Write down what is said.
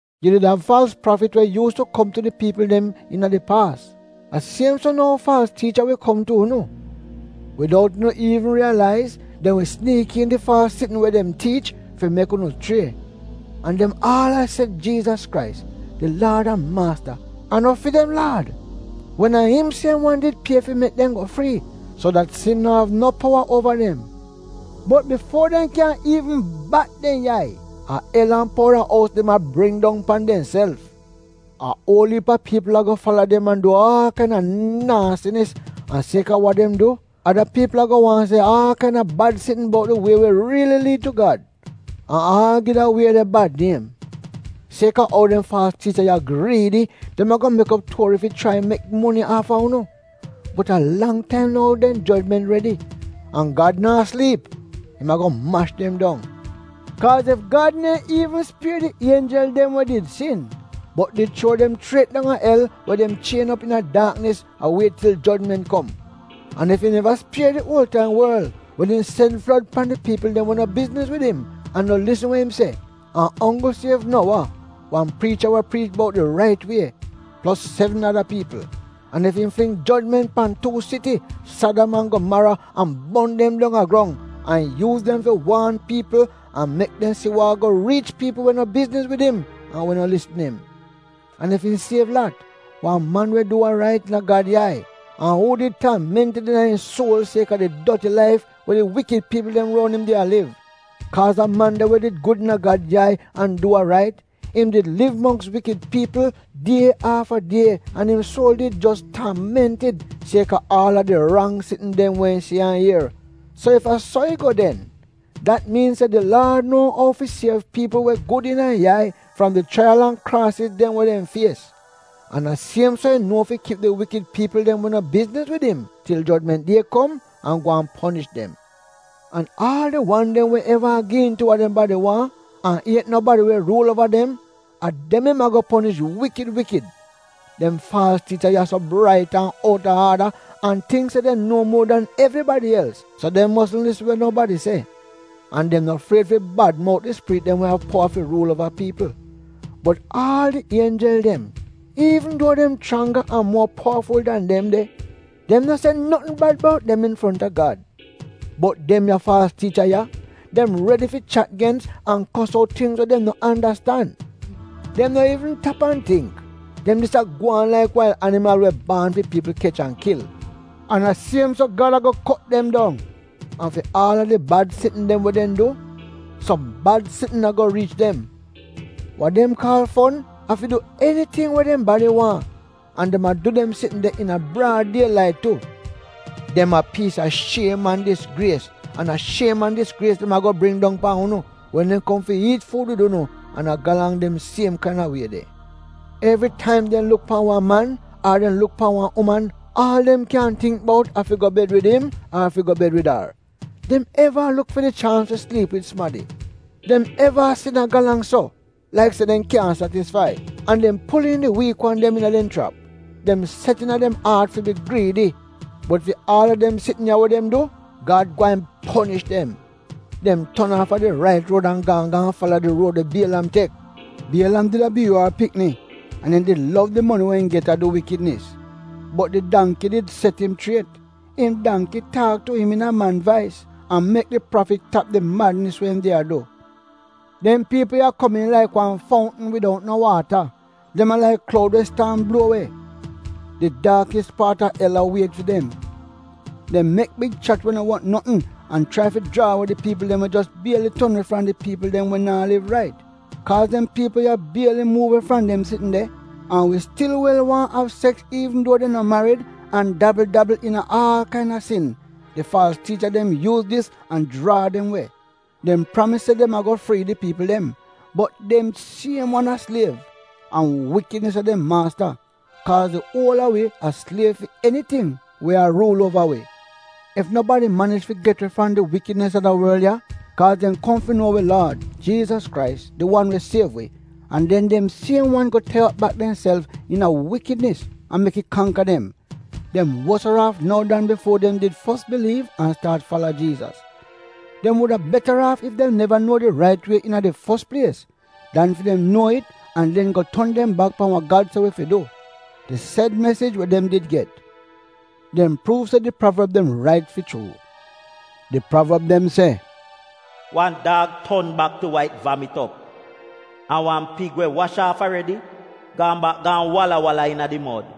Yu did av faalz prafit we yuus tu kom tu di piipl dem iina di paas, a siem so nou faalz tiicha wi kom tu unu. Widout unu iivn si wa a gwaan, dem wi siniik iin di faalz sitn we dem tiich fi mek unu chrie. An dem aal a se Jiizas Krais, di Laad an Maasta, a no fi dem Laad, wen a im siem wan did pie fi mek dem go frii, so dat sin no av no powa uova dem. Bot bifuo dem iivn riyalaiz, a el an powda ous dem a bring dong pan demself. A uol iip a piipl ago fala dem an du aal kaina naasinis. An sieka wa dem du, ada piipl ago waahn se aal kaina bad sitn bout di wie we riili liid tu Gad — an aal gi da wie de bad niem. Sieka ou dem faalz tiicha ya griidi, dem ago mek op tuori fi chrai mek moni aafa unu. Bot a lang taim nou dem jojment redi. An Gad naa sliip, im ago mash dem dong! Kaaz ef Gad neehn iivn spier di ienjel dem we did sin, bot did chuo dem chriet dong a el we dem chien op iina di daak a wiet til jojment kom, an ef im neva spier di uol-taim worl wen im sen flod pan di piipl dem we no bizniz wid im an no lisn we im se, an onggl siev Nowa — wan priicha we priich bout di rait wie — plos sevn ada piipl, an ef im fling jojment pan tuu siti, Sadam an Gomaro an bon dem dong a grong, an yuuz dem fi waan piipl an mek dem si a wa ago riich piipl we no bizniz wid im an we no lisn im, an ef im siev Lat, wan man we du wa rait iina Gad yai, an uu did taamentid iina im suol sieka di doti laif we di wikid piipl dem roun im did a liv, kaaz da man de we did gud iina Gad yai an du wa rait, im did liv mongks wikid piipl die afta die an im suol did jos taamentid sieka aal a di rang sitn dem we im si an ier, so ef a so it go den, dat miin se di Laad nuo ou fi siev piipl we gud iina im yai fram di chraiyal an kraasiz dem we dem fies. An a siem so im nuo fi kip di wikid piipl dem we no bizniz wid im til jojment die kom an gwaan ponish dem. An aal di wan dem we eva gi iin tu wa dem badi waahn an iet nobadi we ruul uova dem, a dem im ago ponish wikid wikid. Dem faalz tiicha ya so brait an out-a-aada an tingk se dem nuo muo dan evribadi els, so dem mosn lisn wa nobadi se. An dem no fried fi bad mout di spirit dem we av powa fi ruul uova piipl. Bot aal di ienjel dem, iivn duo dem chrangga an muo powaful dan dem de, dem no se notn bad bout dem infronta Gad. Bot dem ya faalz tiicha ya, dem redi fi chat gens, an a kos out tingz we dem no andastan. Dem no iivn tap an tingk — dem dis a gwaan laik wail animal we baan fi piipl kech an kil. An a siem so Gad ago kot dem dong! An fi aal a di bad sitn dem we dem du, som bad sitn ago riich dem. Wa dem kaal fon, a fi du eniting we dem badi waahn, an dem a du dem sitn de iina braad die lait tu! Dem a piis a shiem an disgries, an a shiem an disgries dem ago bring dong pan unu wen dem kom fi iit fuud wid unu an a galang dem siem kaina wie de. Evritaim dem luk pan wan man, ar dem luk pan wan uman aal dem kyan tingk bout a fi go bed wid im ar fi go bed wid ar. Dem eva a luk fi di chaans fi sliip wid sumadi. Dem eva a sin a galang so, laik se dem kyaahn satisfai. An dem pul iin di wiik wan dem iina dem chrap. Dem set iina dem aat fi bi griidi. Bot fi aal a dem sitn ya we dem du — Gad gweehn ponish dem! Dem ton aafa di rait ruod an gaan gaan fala di ruod we Bielam tek. Bielam did a Biyuor pikni, an im did lov di moni we im get a du wikidnis. Bot di dangki did set im chriet. Im dangki taak tu im iina man vais, an mek di prafit tap di madnis we im did a du. Dem piipl ya komiin laik wan foutn widout no waata, dem a laik kloud we staam bluo we; di daakis paat a el a wiet fi dem. Dem mek big chat we no wot notn an chrai fi jraa we di piipl dem we jos bieli ton we fram di piipl dem we naa liv rait. Kaaz dem piipl ya bieli muuv we fram dem sitn de, an wi stil wel waahn av seks iivn duo dem no marid an dabl-dabl iina aal kaina sin, di faalz tiicha dem yuuz dis an jraa dem we. Dem pramis se dem ago frii di piipl dem, bot dem siem wan a sliev — an wikidnis a dem maasta, kaaz di uol a wi a sliev fi eniting we a ruul uova wi. Ef nobadi manij fi get we fram di wikidnis a da worl ya, kaa dem kom fi nuo wi Laad, Jiizas Krais, di wan we siev wi, an den dem siem wan go tai op bak demself iina wikidnis an mek it kangka dem, dem wosaraaf nou dan bifuo dem did fos biliiv an staat fala Jiizas. Dem wuda betaraaf ef dem neva nuo di rait wie iina di fos plies, dan fi dem nuo it an den go ton dem bak pan wa Gad se wi fi du — di sed mesij we dem did get. Dem pruuv se di pravorb dem rait fi chuu. Di pravorb dem se, “Wan daag ton bak tu wa it vamit op” an “Wan pig we wash aaf aredi gaan bak gaan wala-wala iina di mod.”